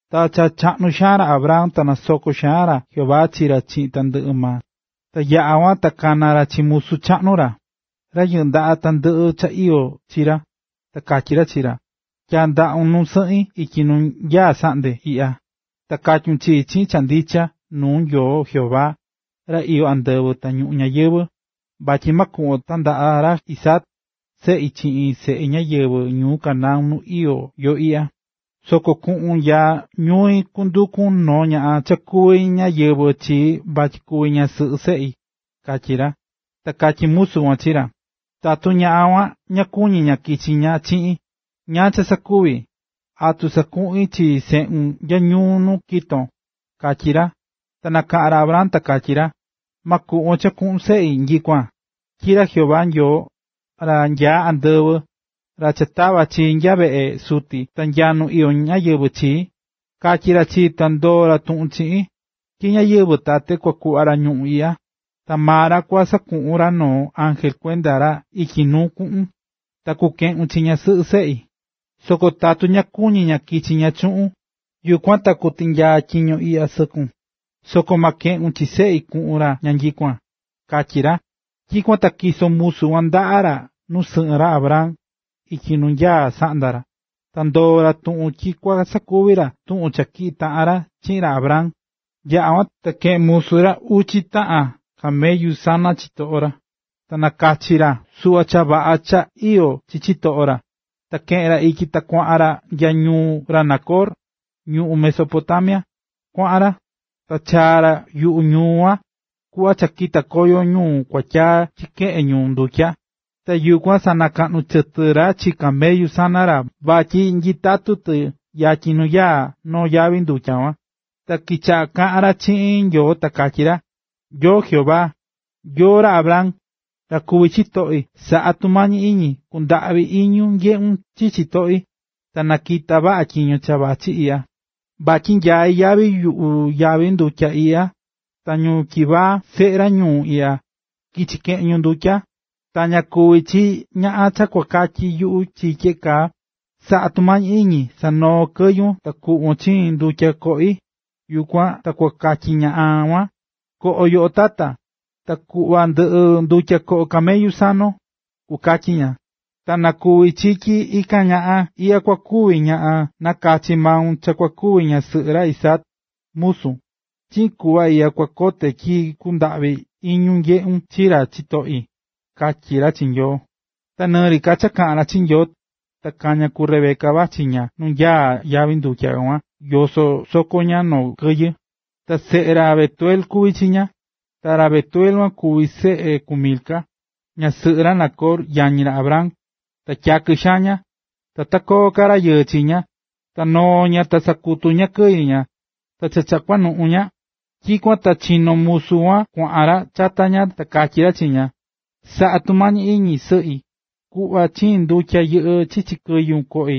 Ta cha chaꞌnu xaan ra Abraham ta nasoko̱ xaan ra Jehová chi ra chiꞌin tandɨꞌɨ maa. Ta yaꞌa̱ kuan ta kana̱ ra chi musu chaꞌnu ra, ra yɨꞌɨ́ ndaꞌa tandɨꞌɨ cha iyó chi ra, ta katyí ra chi ra: ―Tyaa̱ ndaꞌun nu sɨꞌin ityi nu nyaá saꞌndea iꞌya. Ta katyun chii chiꞌin cha ndicha nuu Nyoo Jehová, ra iyó andɨvɨ ta ñuꞌún ñayɨvɨ̱, vatyi ma kuꞌvon tandaꞌa ra Isaac, seꞌi, chiꞌin seꞌe ñáyɨvɨ ñuu Canaán nu iyó yo iꞌya. Soko kuꞌun nya ñui kundukun noo ñaꞌan cha kuví ñáyɨvɨ chii vatyi kuvi ñasɨꞌɨ seꞌi ―katyí ra. Ta katyí musu kuan chi ra: ―Tatu ñaꞌan kuan ta ña kuñí ña kichi ña chiꞌin, ¿ñáá cha sakuvi? ¿Atu sakuꞌin chi seꞌun nya ñuu nu kito̱n? ―katyí ra. Ta nakaꞌa̱n ra Abraham ta katyí ra: ―¡Ma kuꞌvon cha kuꞌun seꞌi nyikuan! Tyi ra Jehová Nyoo, ra nyaá andɨvɨ, ra cha tava̱ chii nya veꞌe suti ta nya ñuu nu iyó ñáyɨvɨ chii, katyi̱ ra chii ta ndoo̱ ra tuꞌun chiꞌin, tyi chi ñáyɨvɨ tate kua kuꞌva ra ñuꞌún iꞌya. Ta maa ra kua sakuꞌun ra noo ángel kuenda ra ityi nuu kuꞌun, ta kukeꞌun chi ñasɨꞌɨ seꞌi. Soko tatu ña kuñi ña kichi ña chuꞌun, yukuan ta kutinyaa tyiño iꞌya sɨkun, soko ma keꞌun chi seꞌi kuꞌun ra nyikuan ―katyí ra. Tyikuan ta tyiso̱ musu kuan ndaꞌa ra nu sɨꞌɨn ra Abraham ityi nu nyaá saꞌnda ra, ta ndoo̱ ra tuꞌun tyi kua sakuvi ra tuꞌun cha tyiꞌi̱ taꞌan ra chiꞌin ra Abraham. Yaꞌa̱ kuan, ta keꞌe̱n musu ra uchi taꞌan camellu sana chitoꞌo ra, ta nakachi̱ ra suꞌva cha vaꞌa ka cha iyó chi chitoꞌo ra. Ta keꞌe̱n ra ityi ta kuaꞌan ra nya ñuu ra Nacor, ñuꞌún Mesopotamia. Kuaꞌan ra, ta chaa̱ ra yuꞌu ñuu kuan, kuꞌva cha kitá koyo ñu kuatyaa chikeꞌén ñu ndutya. Ta yukuan sanakaꞌnu chɨtɨ ra chi camellu sana ra vatyi nyitatu tɨ yatyin nu nyaá noo yavi ndutya kuan. Ta kichaꞌa̱ kaꞌán ra chiꞌin Nyoo ta katyí ra: “Nyoo Jehová, Nyoo ra Abraham, ra kuví chitoꞌi, sa̱ꞌa tumañi iñi kundaꞌvi iñun nyeꞌun chi chitoꞌi, ta na kita vaꞌa tyiño cha vachí iꞌya. Vityin nyaí yatyin yuꞌu yavi ndutya iꞌya ta ñu tyivaa, seꞌe ra ñuu iꞌya, kichi keꞌen ñu ndutya. Ta na kuvi chi tyi ñaꞌan cha kukatyi yuꞌu chi tyeꞌe kaa: ‘Sa̱ꞌa tumañi iñi sa̱noo kɨyun ta kuꞌvon chiin ndutya koꞌi.’ Yukuan ta kukatyi ñaꞌan kuan: ‘Koꞌo yoꞌo, tata, ta kua kuꞌva ndɨꞌi ndutya koꞌo camellu sanon’, kukatyi ña. Ta na kuvi chi tyi ikan ñaꞌan iꞌya kua kuvi ñaꞌan nakachi̱ maun cha kua kuvi ñasɨꞌɨ ra Isaac, musun. Chiꞌin kuꞌva iꞌya kua kote tyi kundaꞌví iñun nyeꞌun chi ra chitoꞌi”, katyí ra chi Nyoo. Ta ni kaꞌán ka ra chiꞌin Nyoo, ta kaña̱ ku Rebeca, vachí ña nu nyaá yavi ndutya kuan yosó soko ña noo kɨyɨ. Ta seꞌe ra Betuel kuví chi ña, ta ra Betuel kuan kuví seꞌe ku Milca, ñasɨꞌɨ ra Nacor, yañi ra Abraham. Ta tyakɨ xaan ña, ta ta koo ka rayɨɨ chi ña. Ta noo̱ ña ta sakutu̱ ña kɨyɨ ña. Ta cha cha kuanuꞌun ña, tyikuan ta chinó musu kuan kuaꞌan ra chata ña ta katyí ra chi ña: ―Sa̱ꞌa tumañi iñi, sɨꞌi, ku̱ꞌva chiin ndutya yɨꞌɨ́ chichi kɨyun koꞌi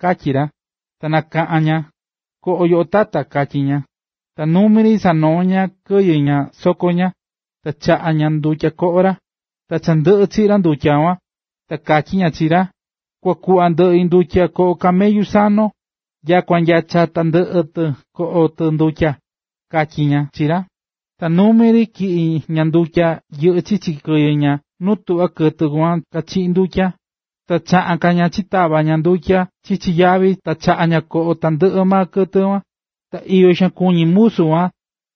―katyí ra. Ta nakaꞌa̱n ña: ―Ko̱ꞌo yoꞌo, tata ―katyí ña. Ta numi ri sanoo̱ ña kɨyɨ ña soko ña, ta chaꞌa̱ ña ndutya koꞌo ra. Ta cha ndɨꞌɨ chiꞌi̱ ra ndutya kuan, ta katyí ña chi ra: ―Kua kuꞌva ndɨꞌi ndutya koꞌo camellu sanon, nyakua nya cha tandɨꞌɨ tɨ koꞌo tɨ ndutya ―katyí ña chi ra. Ta numi ri tyiꞌi̱ ña ndutya yɨꞌɨ́ chichi kɨyɨ ña nu tuꞌvá kɨtɨ kuan kachiꞌí ndutya. Ta chaꞌa̱n ka ña chitava̱ ka ña ndutya chichi yavi ta chaꞌa̱ ña koꞌo tandɨꞌɨ kɨtɨ kuan. Ta iyo xaan kuñí ra musu kuan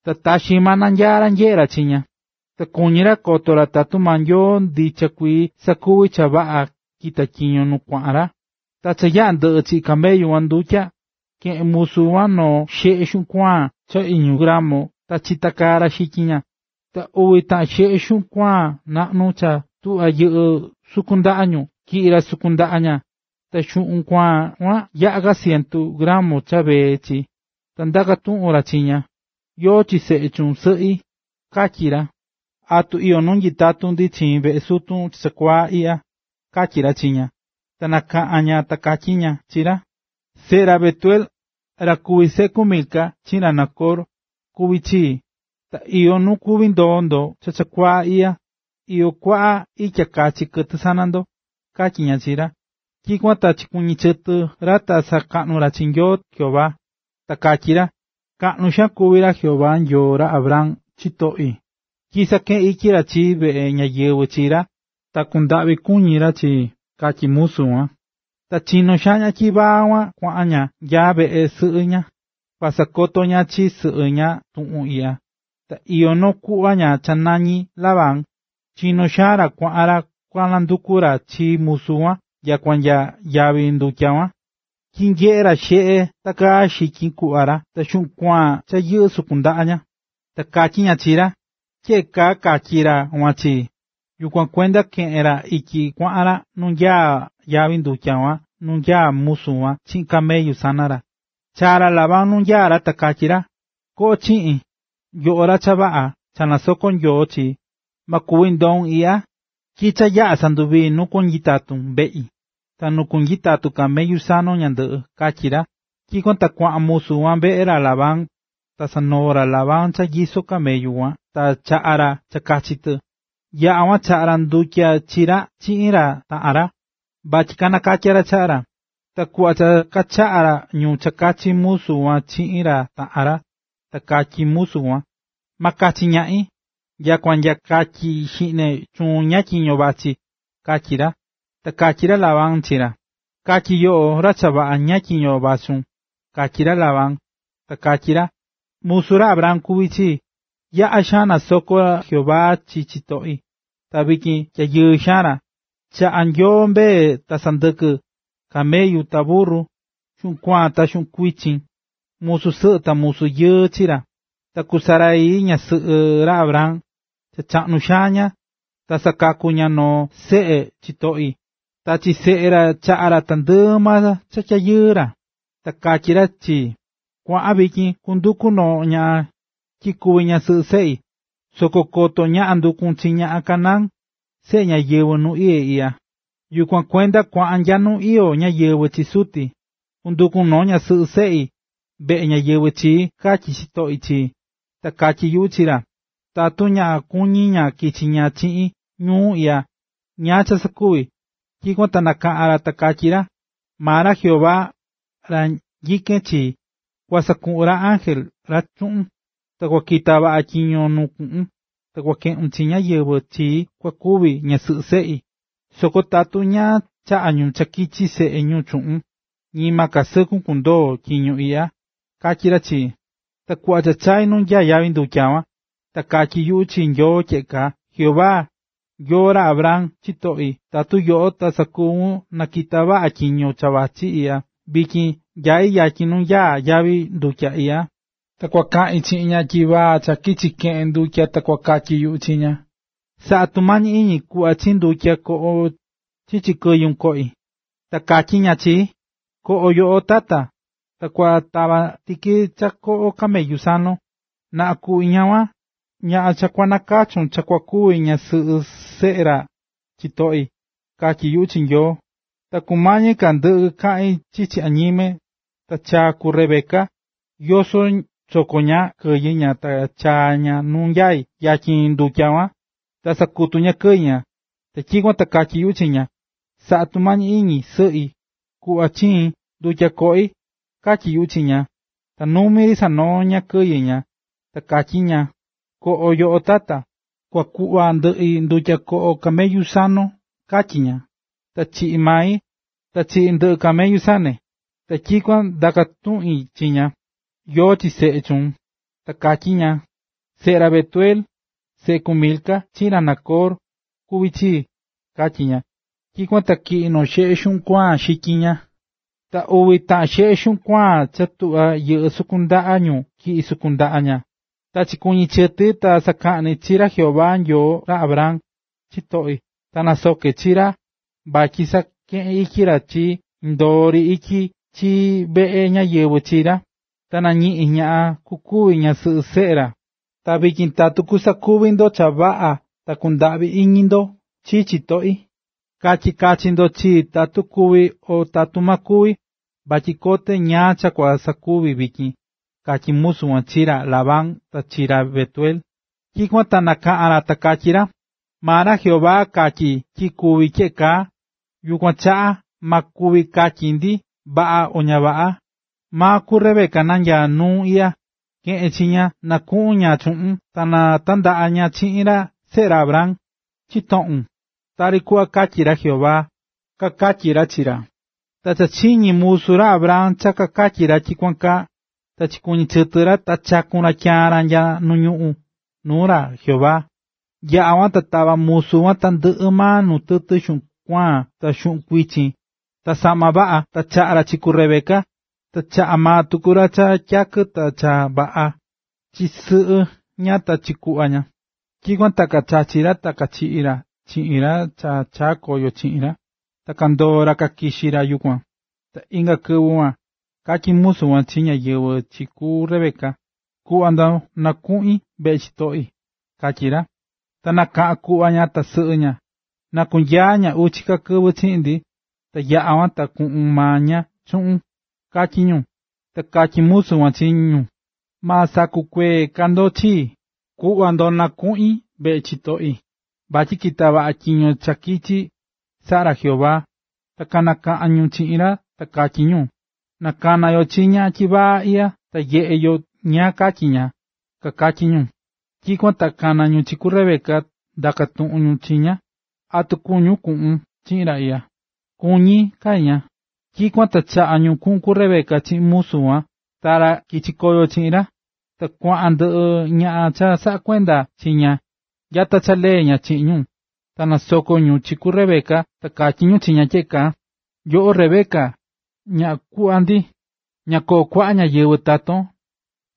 ta taxi maa nanyaá ra nyeꞌé ra chi ña, ta kuñí ra koto ra tatu maa Nyoo ndicha kuii sakuvi̱ cha vaꞌa kita̱ tyiño nu kuaꞌan ra. Ta cha yaꞌa̱ ndɨꞌɨ̱ chiꞌi̱ camellu kuan ndutya, keꞌe̱n musu kuan noo xeꞌe xuꞌun kuaan cha iñu gramo ta chitakaa̱ ra xityin ña, ta uvi taꞌan xeꞌe xuꞌun kuaan naꞌnu cha tuꞌvá yɨꞌɨ́ sukun ndaꞌa ñu, tyiꞌi̱ ra sukun ndaꞌa ña. Ta xuꞌun kuaan kuan yaꞌa̱ ka cientu gramo cha vee chi. Ta ndaka̱ tuꞌun ra chi ña: ―¿Yóó chi seꞌe chuun, sɨꞌi? ―katyí ra―. ¿Atu iyó nu kuví nyitatu ndi chiin veꞌe sutun chakuaa iꞌya? ―katyí ra chi ña. Ta nakaꞌa̱n ña ta katyí ña chi ra: ―Seꞌe ra Betuel, ra kuví seꞌe ku Milca chiꞌin ra Nacor, kuví chii. Ta iyó nu kuví ndoo ndo chakuaa iꞌya, ta iyó kuaꞌa itya kachi kɨtɨ sana ndo ―katyí ña chi ra. Tyikuan ta chikuɨñɨ̱ chɨtɨ ra ta sakaꞌnu̱ ra chi Nyoo Jehová. Ta katyí ra: “Kaꞌnu xaan kuví ra Jehová Nyoo ra Abraham, chitoꞌi, tyi sakeꞌe̱n ityi ra chii veꞌe ñáyɨvɨ chi ra, ta kundaꞌvi kuñi̱ ra chii”, katyí musu kuan. Ta chinó xaan ñaꞌan tyivaa kuan kuaꞌan ña nya veꞌe sɨꞌɨ ña, kua sakoto ña chi sɨꞌɨ ña tuꞌun iꞌya. Ta iyó noo kuꞌva ña cha nañí Labán, chinó xaan ra kuaꞌan ra kua nanduku ra chi musu kuan nya nu nyaá yavi ndutya kuan, tyi nyeꞌe̱ ra xeꞌe takaá xityin kuꞌva ra ta xuꞌun kuaan cha yɨꞌɨ́ sukun ndaꞌa ña. Ta katyí ña chi ra: “Tyeꞌe kaa katyi̱ ra kuan chii.” Yukuan kuenda keꞌe̱n ra ityi kuaꞌan ra nu nyaá yavi ndutya kuan nu nyaá musu kuan chiꞌin camellu sana ra. Chaa̱ ra Labán nu nyaá ra ta katyí ra: ―Koꞌo chiꞌin, yoꞌo ra cha vaꞌa cha nasokó ra Jehová chii, ma kuvi ndoun iꞌya, tyi cha yaꞌa̱ sanduvaꞌi̱ nu kua kunyitatun veꞌi, ta nu kunyitatu camellu sanon ñandɨꞌɨ ―katyí ra. Tyikuan ta kuaꞌan musu kuan veꞌe ra Labán, ta sanoo̱ ra Labán cha nyisó camellu kuan ta chaꞌa̱ ra cha kachi tɨ. Yaꞌa̱ kuan ta chaꞌa̱ ra ndutya chi ra chiꞌin ra taꞌan ra, vatyi kanakatya ra chaꞌa ra. Ta kuꞌva cha kachaꞌa̱ ñu cha kachi musu kuan chiꞌin ra taꞌan ra, ta katyí musu kuan: ―Ma kachi ñaꞌin, nyakua nya katyi xiꞌne chuun ñáá tyiño vachí ―katyí ra. Ta katyí ra Labán chi ra: ―Ka̱tyi yoꞌo ra chavaꞌa ñáá tyiño vachún ―katyí ra Labán. Ta katyí ra: ―Musu ra Abraham kuví chii. Yaꞌa̱ xaan nasoko̱ ra Jehová chi chitoꞌi, ta vityin tyayɨɨ xaan ra. Chaꞌa̱ Nyoo mbee ta sɨndɨkɨ, camellu ta burru, xuꞌun kuaan ta xuꞌun kuichin, musu sɨꞌɨ ta musu yɨɨ chi ra. Ta ku Sara, ñasɨꞌɨ ra Abraham, cha chaꞌnu xaan ña, ta sakaku̱ ña noo seꞌe chitoꞌi. Ta chi seꞌe ra chaꞌa̱ ra tandɨꞌɨ maa cha tyayɨɨ ra. Ta katyi̱ ra chii: ‘‘Kua̱ꞌan vityin kundukun noo ñaꞌan tyi kuvi ñasɨꞌɨ seꞌi, soko koto ñaꞌan ndukun chi ñaꞌan Canaán, seꞌe ñáyɨvɨ nu iyé iꞌya, yukuan kuenda kua̱ꞌan nya nu iyó ñáyɨvɨ chi suti, kundukun noo ñasɨꞌɨ seꞌi veꞌe ñáyɨvɨ chii”, katyi̱ chitoꞌi chii. Ta katyi̱ yuꞌu chi ra: ‘‘Tatu ña kuñí ña kichi ña chiꞌin ñuu iꞌya, ¿ñáá cha sakuvi?” Tyikuan ta nakaꞌa̱n ra, ta katyí ra: “Maa ra Jehová, ra nyikén chi, kua sakuꞌun ra ángel ra chuꞌun, ta kua kita vaꞌa tyiño nu kuꞌun, ta kua keꞌun chi ñáyɨvɨ chii kua kuvi ñasɨꞌɨ seꞌi. Soko tatu ña chaꞌá ñu chi seꞌe ñu chuun, ñima ka sɨkun kundoo tyiño iꞌya”, katyi̱ ra chii. ”Ta kuꞌva cha chai̱ nu nyaá yavi ndutya kuan, ta katyí yuꞌu chi Nyoo tyeꞌe kaa: “Jehová Nyoo ra Abraham, chitoꞌi, tatu yoꞌo ta sakuvun na kita vaꞌa tyiño cha vachí iꞌya, vityin nyai yatyin nu nyaá yavi ndutya iꞌya, ta kua kaꞌin chiꞌin ñaꞌan tyivaa cha kichi keꞌen ndutya ta kukatyi yuꞌu chi ña: ‘Sa̱ꞌa tumañi iñi ku̱ꞌva chiin ndutya ñoꞌón chichi kɨyun koꞌi.’ Tatu katyí ña chii: ‘Ko̱ꞌo, yoꞌo, tata, ta kua tava tiki cha koꞌo camellu sanon’. Na kuvi ñaꞌan kuan, ñaꞌan cha nakachu̱n cha kua kuvi ñasɨꞌɨ seꞌe ra chitoꞌi”, katyí yuꞌu chi Nyoo. Ta kumañi ka ndɨꞌɨ kaꞌi̱n chichi añime, ta chaa̱ ku Rebeca, yosó soko ña kɨyɨ ña ta chaa̱ ña nu nyaá yavi ndutya kuan, ta sakutu̱ ña kɨyɨ ña. Tyikuan ta katyí yuꞌu chi ña: ‘Sa̱ꞌa tumañi iñi, sɨꞌi, ku̱ꞌva chiin ndutya koꞌi’, katyí yuꞌu chi ña. Ta numi ri sanoo̱ ña kɨyɨ ña, ta katyí ña: ‘Ko̱ꞌo yoꞌo, tata, ta kua kuꞌva ndɨꞌi ndutya koꞌo camellu sanon’, katyí ña. Ta chiꞌi̱ mai, ta chiꞌi̱ tandɨꞌɨ camellu sane. Tyikuan ta ndaka̱ tuꞌin chi ña: ‘Yóó chi seꞌe chuun.’ Ta katyí ña: ‘Seꞌe ra Betuel, seꞌe ku Milca chiꞌin ra Nacor, kuví chii’, katyí ña. Tyikuan ta tyiꞌi̱ noo xeꞌe xityin ña, ta uvi taꞌan xeꞌe xuꞌun kuaan cha tuꞌvá yɨꞌɨ́ sukun ndaꞌa ñu tyiꞌi̱ sukun ndaꞌa ña. Ta chikuɨñɨ̱ chɨti ta sakaꞌni̱ chi ra Jehová Nyoo ra Abraham, chitoꞌi, ta nasoke̱ chi ra vatyi sakeꞌe̱n ityi ra indoo ityi ri chii veꞌe ñáyɨvɨ chi ra, ta ñiꞌi̱n ñaꞌan kukuvi ñasɨꞌɨ seꞌe ra. Ta vityin tatu kusakuvi ndo cha vaꞌa ta kundaꞌvi iñi ndo chi chitoꞌi, ka̱tyi kachi ndo chii tatu kuvi o tatu ma kuvi, vatyi kote ñáá cha kua sakuvi vityin ―katyí musu kuan chi ra Labán ta chi ra Betuel. Tyikuan ta kanakaꞌa̱n ra, ta kakatyí ra: ―Maa ra Jehová katyi̱ tyi kuví tyeꞌe kaa, yukuan chaꞌa ma kuvi katyi ndi vaꞌa o ña vaꞌa. Maa ku Rebeca nanyaá nuun iꞌya, ke̱ꞌen chi ña na kuꞌun ña chuꞌun ta na tandaꞌa ña chiꞌin seꞌe ra Abraham, chitoꞌun, tari kuꞌva katyí ra Jehová ―kakatyí ra chi ra. Ta cha chiñi̱ musu ra Abraham cha kakatyi̱ ra tyikuan kaa, ta chikuɨñɨ̱ chɨtɨ ra ta chaku̱n ra tyaan ra nya nu ñuꞌún nuu ra Jehová. Yaꞌa̱ kuan, ta tava̱ musu kuan tandɨꞌɨ maa nuu tɨtɨ xuꞌun kuaan ta xuꞌun kuichin ta saꞌma vaꞌa, ta chaꞌa̱ ra chi ku Rebeca, ta chaꞌa̱ maa tuku ra cha tyakɨ ta cha vaꞌa chi sɨꞌɨ ña ta chi kuꞌva ña. Tyikuan ta kachachi̱ ra ta kachiꞌi̱ ra chiꞌin ra cha chaa̱ koyo chiꞌin ra, ta kandoo̱ ra kakixi̱ ra yukuan. Ta inga kɨvɨ kuan, katyí musu kuan chi ñáyɨvɨ chi ku Rebeca: ―Ku̱ꞌva ndo na kunuꞌi veꞌe chitoꞌi ―katyí ra. Ta nakaꞌa̱n kuꞌva ña ta sɨꞌɨ ña: ―Na kunyaa ña uchi ka kɨvɨ chiꞌin ndi, ta yaꞌa kuan ta kuꞌun maa ña chuꞌun ―katyí ñu. Ta katyí musu kuan chi ñu: ―Ma sakukuee ka ndo chii. Ku̱ꞌva ndo na kunuꞌi veꞌe chitoꞌi, vatyi kita̱ vaꞌa tyiño cha kichi̱, saꞌa̱ ra Jehová. Ta kanakaꞌa̱n ñu chiꞌin ra ta katyí ñu: ―Na kana yo chi ñaꞌan tyivaa iꞌya ta nyeꞌe yo ñáá katyi maa ña ―kakatyí ñu. Yukuan ta kana̱ ñu chi ku Rebeca ta ndaka̱ tuꞌun ñu chi ña: ―¿Atu kuñún kuꞌun chiꞌin ra iꞌya? ―Kuñí ―katyí ña. Tyikuan ta chaꞌa̱ ñu kuꞌun ku Rebeca chiꞌin musu kuan ta ra kichi̱ koyo chiꞌin ra. Ta kuaꞌan ndɨꞌɨ ñaꞌan cha saꞌakuendá chi ña nya ta lee ña chiꞌin ñu. Ta nasoko̱ ñu chi ku Rebeca ta katyí ñu tyeꞌe kaa: “Yoꞌo Rebeca, ñaꞌan kuꞌva ndi, ¡na koo kuaꞌa ñáyɨvɨ taton!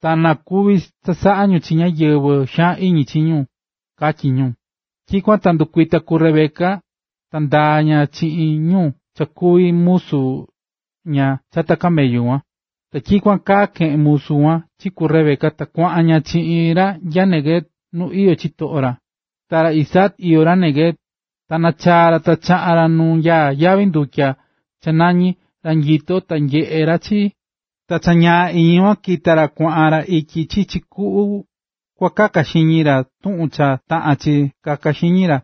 ¡Ta na kuvi chasaꞌa ñu chi ñáyɨvɨ xaan iñi chi ñu!”, katyí ñu. Tyikuan ta ndukuita̱ ku Rebeca, ta ndaa̱ ña chiꞌin ñu cha kuví musu ña chata camellu kuan. Ta tyikuan kaa keꞌe̱n musu kuan chi ku Rebeca ta kuaꞌan ña chiꞌin ra nya Neguev nu iyó chitoꞌo ra. Ta ra Isaac iyó ra Neguev, ta nachaa̱ ra cha chaꞌa̱n ra nu nyaá yavi ndutya cha nañí “Ra nyito ta nyeꞌé ra chii”. Ta cha iñi kuan kitá ra kuaꞌan ra ityi chichi kuꞌu kua kaka xiñi ra tuꞌun cha taꞌan chi kaka xiñi ra.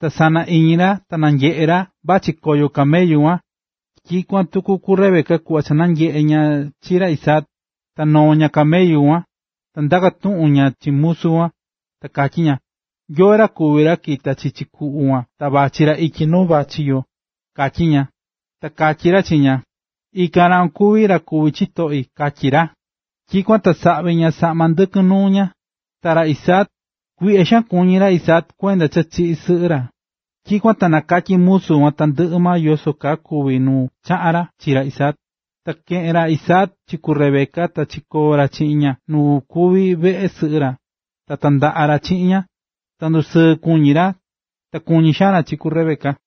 Ta sana iñi ra ta nanyeꞌe̱ ra vachí koyo camellu kuan. Tyikuan tuku ku Rebeca kuꞌva cha nanyeꞌe̱ ña chi ra Isaac, ta noo̱ ña camellu kuan. Ta ndaka̱ tuꞌun ña chi musu kuan, ta katyí ña: ―¿Yóó ra kuví ra kita̱ chichi kuꞌu kuan ta vachí ra ityi nu vachí yo? ―katyí ña. Ta katyí ra chi ña: ―Ikan ra kuan kuví ra kuví chitoꞌi ―katyí ra. Tyikuan ta saꞌvi̱ ña saꞌma ndɨkɨn nuu ña. Ta ra Isaac, kuiꞌya xaan kuñí ra cha kuenda cha chiꞌi̱ sɨꞌɨ ra. Tyikuan ta nakatyi̱ musu kuan tandɨꞌɨ maa yoso kaa kuvi̱ nu chaꞌa̱n ra chi ra Isaac. Ta keꞌe̱n ra Isaac chi ku Rebeca, ta chikoo̱ ra chiꞌin ña nu kuví veꞌe sɨꞌɨ ra, ta tandaꞌa̱ ra chiꞌin ña. Ta ndusɨɨ kuñí ra, ta kuñí xaan ra chi ku Rebeca.